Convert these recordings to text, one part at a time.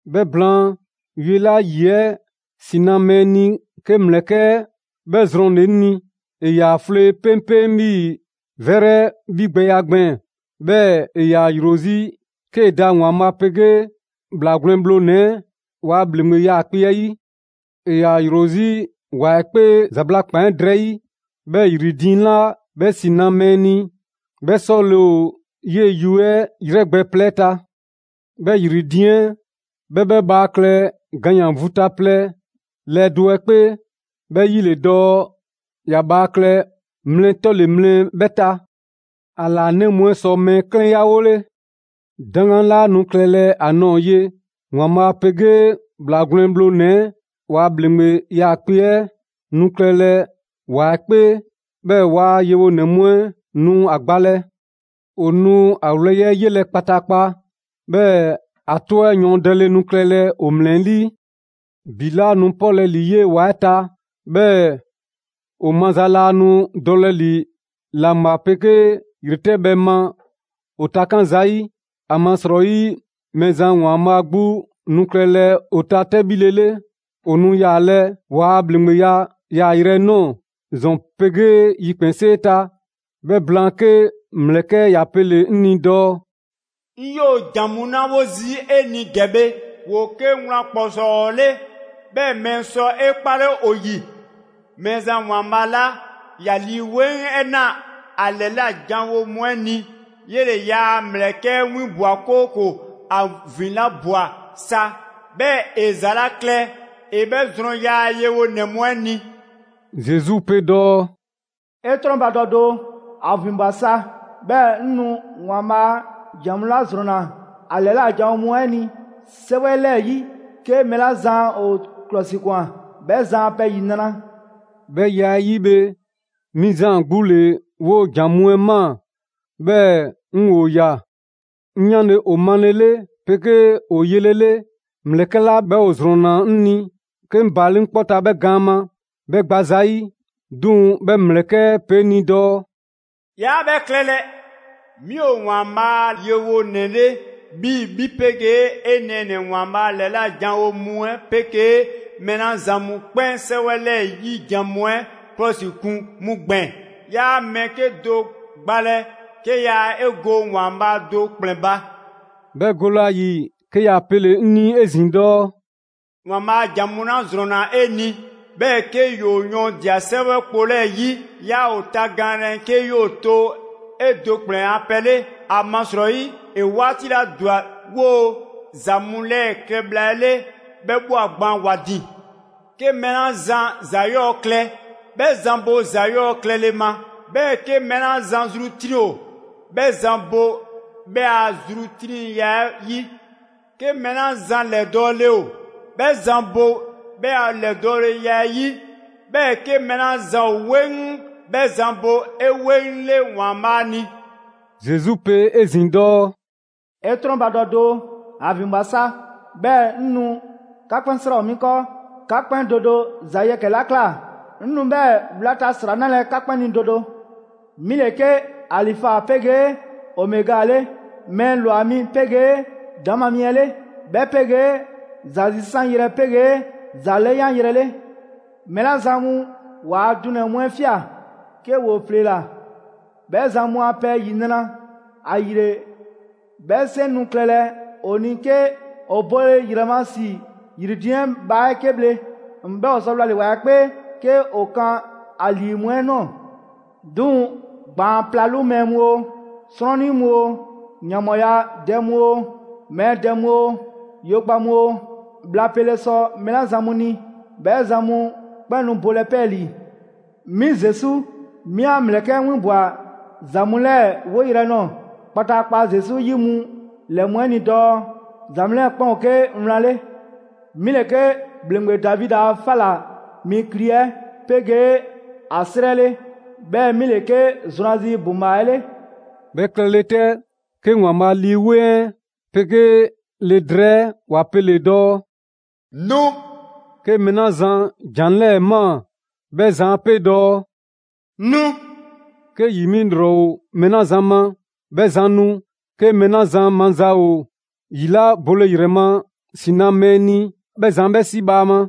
'Bhɛ blaan, yue 'la ‑yi 'ɛ ‑si na mɛɛ ni ‑mlɛkɛ' 'bhɛ ‑zrɔnna 'ŋ ni. ‑E ‑yaa 'flee 'peŋpeŋ 'bhii‑ 'vɛrɛ 'bhigbɛya gbɛɛn‑, 'bhɛɛ‑ ‑e ‑yaa ‑yro 'zi 'kee‑ da ‑Waanbhaa' 'pegee ‑Bhlaa Gwlɛn Bhlonɛ‑ 'ɛ waa ‑bhleŋgbe 'yaakpe‑ 'ɛ 'yi. ‑E ‑yaa ‑yro 'zi ‑wa 'ɛ 'kpee ‑zabla' ‑kpan 'ɛ drɛyi', 'bhɛɛ‑ ‑yri diiŋ 'la 'bhɛ ‑si na mɛɛ ni 'bhɛ 'sɔle‑ ‑o 'yee‑ yue 'ɛ 'yrɛgbɛ‑ plɛ 'ɛ ta. 'Bhɛ ‑yri diiŋ 'ɛ 'bhɛ 'bhɛ bhaa klɛ ganyan‑ vu ta plɛ lɛɛ do 'ɛ 'kpee, 'bhɛ 'yi ‑le dɔɔ ‑ya bhaa klɛ mlɛ 'tɔle‑ mlɛ 'bhɛ ta. ‑A ‑laanɛ' mu 'ɛ sɔ mɛɛ 'klɛnyawole. 'Daŋgan 'laa nu klɛlɛ ‑a ꞊nɔɔ ye. ‑Waanbhaa' 'pegee ‑Bhlaa Gwlɛn Bhlonɛ‑ 'ɛ ‑waa ‑bhleŋgbe 'yaakpe‑ 'ɛ nu klɛle ‑wa 'ɛ 'kpee, 'bhɛɛ‑ ‑yaa' yewonɛ mu 'ɛ nu ‑a gbalɛ. ‑O nu ‑a ‑wlɛyi' 'ɛ 'yelɛ‑ kpataakpa, 'bhɛɛ‑ ‑a 'tɔ 'ɛ yɔɔndɛle nu klɛlɛ ‑o ‑mlɛlii'. ‑Bi 'laa nu 'pɔlɛ‑ ‑li 'yee‑ ‑wa 'ɛ ta, 'bhɛɛ‑ ‑o maza laa nu dɔlɛ ‑li ‑laŋbha 'pegee ‑yretɛbhɛ ma ‑o takan' zayi'; ‑amasrɔyi, Mɛɛzan ‑Waanbhaa' 'gbu nu klɛlɛ ‑o ta 'tɛbhile 'le. ‑O nu yaalɛ ‑waa' ‑bhleŋgbeya yaayrɛ 'ɛ ꞊nɔɔ ‑zɔn 'pegee yikpɛnsee ta. 'Bhɛ blaan, 'ke ‑mlɛkɛ' ‑ya pele‑ 'ŋ ni dɔɔ: «'Ŋ 'yoo‑ ‑jan mu 'la 'wo zii' 'e ni ‑gɛ bhe, ‑woo 'ke wlan ‑kpɔsɔɔ 'le, 'bhɛɛ‑ mɛɛ sɔ 'e 'kpale ‑o ‑yi. Mɛɛzan ‑Waanbhaa' 'la ‑ya Lii 'Weŋ 'ɛ na ‑a ‑lɛla' janwo mu 'ɛ ni, 'yele‑ ‑yaa' ‑mlɛkɛ' 'ɛ 'winbwa‑, 'kooko‑ ‑a ‑vinlabwa sa, 'bhɛɛ‑ ‑e ‑za 'la klɛ, ‑e 'bhɛ zrɔn ‑yaa' yewonɛ mu 'ɛ ni.» Zesu pe dɔɔ: «'E 'trɔnbadɔ doo! ‑A ‑vinbwa sa, 'bhɛɛ‑ 'ŋ nu! ‑Waanbhaa' ‑jan mu 'la ‑zrɔnna ‑a ‑lɛla' janwo mu 'ɛ ni 'sɛwɛ 'lɛɛ‑ 'yi, 'ke mɛɛ 'la zan ‑o ‑klɔsikwan, 'bhɛ zan a pɛ ‑yinra'!» 'Bhɛ ya 'ɛ 'yi bhe, 'mi Zaan 'gbu ‑le 'woo‑ ‑za mu 'ɛ ꞊maa, 'bhɛɛ‑ 'ŋ ‑o ꞊ya. 'Ŋ 'yanle‑ ‑o male 'pegee ‑o yelele, ‑mlɛkɛ' 'la 'bhɛ ‑o ‑zrɔnna 'ŋ ni, 'ke 'ŋ baale' 'ŋ 'kpɔ ta 'bhɛ gaan ma 'bhɛ gba zayi'. 'Duŋ‑ 'bhɛ ‑mlɛkɛ' 'ɛ pe 'ŋ ni dɔɔ: «'Yaa 'bhɛ klɛlɛ! 'Mi ‑o ‑Waanbhaa' a yewonɛ 'le 'bhii‑ 'bhi 'pegee 'e nɛɛnɛ‑ ‑Waanbhaa' ‑lɛla' janwo mu 'ɛ 'pegee mɛɛ 'la zan mu 'kpɛn 'sɛwɛ 'lɛɛ‑ 'yi jan mu 'ɛ 'klɔsikun 'mu gbɛɛn‑. 'Yaa mɛɛ 'kedo‑ gbalɛ, 'ke yaa 'e go ‑Waanbhaa' do ‑kplɛn ba!» 'Bhɛ gole ‑a ‑yi, 'ke ‑ya pele‑ 'ŋ ni 'ezin‑ dɔɔ: «‑Waanbhaa' ‑jan mu 'la ‑zrɔnna 'e ni, 'bhɛɛ‑ 'ke 'yoo‑ yɔɔndia‑ 'sɛwɛ kpo 'lɛɛ‑ 'yi, 'yaa ‑o tagaanlɛ 'ke 'yoo‑ to 'e do ‑kplɛn ‑a pɛ 'le; ‑amasrɔyi ‑e 'waati 'la ‑dwa 'woo‑ ‑za mu 'lɛɛ‑ klɛ bhla 'ɛ 'le, 'bhɛ ꞊bhwa gban ‑wa ‑din. 'Ke mɛɛ 'la zan ‑za 'yɔɔ klɛ, 'bhɛ zan bo ‑za 'yɔɔ‑ klɛle ma, 'bhɛɛ‑ 'ke mɛɛ 'la zan zru 'triŋ ‑o, 'bhɛ zan bo 'bhɛ a zru 'triŋya‑ 'ɛ 'yi; 'ke mɛɛ 'la zan ‑lɛdɔɔle ‑o, 'bhɛ zan bo 'bhɛ a ‑lɛdɔɔleya 'ɛ 'yi, 'bhɛɛ‑ 'ke mɛɛ 'la zan ‑o 'weŋ 'bhɛ zan bo 'eweŋle ‑Waanbhaa' ni.» Zesu pe 'ezin‑ dɔɔ: «'E 'trɔnbadɔ doo, ‑a ‑vinbwa sa 'bhɛɛ‑ 'ŋ nu! 'Ka 'kpɛn 'sra‑ ‑o 'mi 'kɔɔ, 'ka 'kpɛn do do ‑za yɛkɛ‑ 'la ꞊kla 'ŋ nu 'bhɛɛ‑ wlata ‑sra 'nalɛ‑ 'ka 'kpɛn ni do do. 'Mi ‑le 'ke Alifa 'pegee Omega 'le, mɛɛ ‑lwa mi 'pegee ‑daŋ' ma mi 'ɛ 'le, 'bhɛ 'pegee ‑za zisanyrɛ 'pegee ‑za 'lɛyanyrɛ 'le.» Mɛɛ 'la zan mu ‑waa' dunɛ‑ mu 'ɛ ꞊fia 'ke ‑woo ‑fleela, 'bhɛ zan mu a pɛ ‑yinra'! ‑Ayile, 'bhɛ 'seŋ nu klɛlɛ ‑o ni 'ke ‑o bole ‑yrɛ ma ‑si ‑yri diiŋ 'ɛ bhaa 'ɛ 'ke bhle, 'bhɛɛ‑ ‑o sɔ wlale‑ ‑wa 'ɛ 'kpee 'ke ‑o kan ‑a ‑lii mu 'ɛ ꞊nɔɔ. 'Duŋ‑ ‑gbaan' 'plalu mɛɛ mu oo, 'srɔnnii mu oo, ‑yanbhɔɔyadɛ mu oo, mɛɛ dɛ mu oo, yo gba mu oo, bhla pele sɔ mɛɛ 'la zan mu ni, 'bhɛ zan mu 'kpɛn nu bolɛ 'pɛɛlii‑. «'Mi Zesu 'mi 'an ‑mlɛkɛ' 'ɛ 'winbwa‑ ‑za mu 'lɛɛ‑ 'woyrɛ‑ nɔɔ‑ kpataakpa Zesu 'yi mu ‑lɛ mu 'ɛ ni dɔɔ: ‑Za mu 'lɛɛ‑ 'kpɛn ‑o 'ke wlan 'le. 'Mi 'le 'ke ‑bhleŋgbe Davidi a 'fa ‑la mi kli 'ɛ 'pegee ‑a 'srɛ 'le, 'bhɛɛ‑ 'mi ‑le 'ke zrwanzi ‑buŋbhaa 'ɛ 'le.» 'Bhɛ klɛle 'tɛ, 'ke ‑Waanbhaa' Lii 'Weŋ 'ɛ 'pegee Le drɛɛ 'ɛ ‑wa pele‑ dɔɔ: «Nu!» 'Ke mɛɛ 'la zan ‑jan 'lɛɛ‑ ꞊maa, 'bhɛ zan 'a 'pe dɔɔ: «Nu!» 'Ke ‑yi 'mi ‑lrɔ ‑o mɛɛ 'la zan ma, 'bhɛ zan nu. 'Ke mɛɛ 'la zan maza ‑o ‑yi 'la bole ‑yrɛ ma ‑si na mɛɛ ni, 'bhɛ zan 'bhɛ 'si bhaama.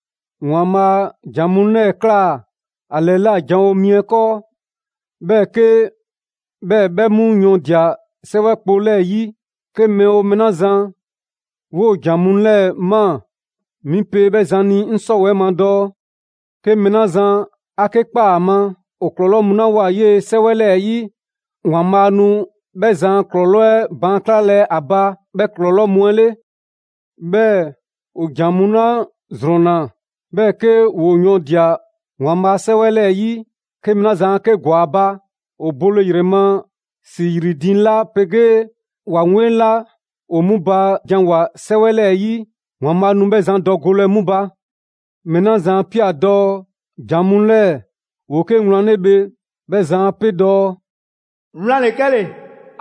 ‑Waanbhaa' ‑jan mu 'lɛɛ‑ ꞊klaa ‑a ‑lɛla' janwo mi 'ɛ 'kɔɔ, 'bhɛɛ‑ 'bhɛ 'mu yɔɔndia 'sɛwɛ kpo 'lɛɛ‑ 'yi, 'ke mɛɛ 'oo mɛɛ 'la zan 'woo‑ ‑jan mu 'lɛɛ‑ ꞊maa, 'mi pe 'bhɛ zan ni 'ŋ 'sɔwɛɛ‑ ma dɔɔ: 'Ke mɛɛ 'la zan ‑a 'ke ꞊kpaa ‑a ma, ‑o ‑klɔlɔɔ' mu 'la ꞊woa 'yee‑ 'sɛwɛ 'lɛɛ‑ 'yi, ‑Waanbhaa' nu 'bhɛ zan a ‑klɔlɔɔ' 'ɛ baan' 'klalɛ a ba 'bhɛɛ‑ ‑klɔlɔɔ' mu 'ɛ 'le. 'Bhɛɛ‑ ‑o ‑jan mu 'la ‑zrɔnna, 'bhɛɛ‑ 'ke ‑woo yɔɔndia‑ ‑Waanbhaa' 'Sɛwɛ 'lɛɛ‑ 'yi, 'ke mɛɛ 'la zan 'a 'ke ‑gwa ‑a ba, ‑o bole ‑yrɛ ma ‑si ‑yri diiŋ 'la 'pegee ‑wa 'weŋ 'la ‑o 'mu ba janwoa‑ 'sɛwɛ 'lɛɛ‑ 'yi, ‑Waanbhaa' nu 'bhɛ zan dɔ golɛ 'mu ba. Mɛɛ 'la zan 'a ꞊pia dɔɔ ‑jan mu 'lɛɛ‑ ‑woo 'ke wlan 'le bhe, 'bhɛ zan pe dɔɔ: «Wlan ‑le 'kɛle‑,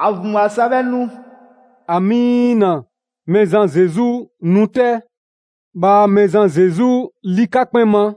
‑a ‑vinbwa sa 'bhɛɛ‑ 'ŋ nu!» ‑Amiina! Mɛɛzan Zesu, nu 'tɛ! Bhaa Mɛɛzan Zesu ‑li 'ka 'kpɛn ma!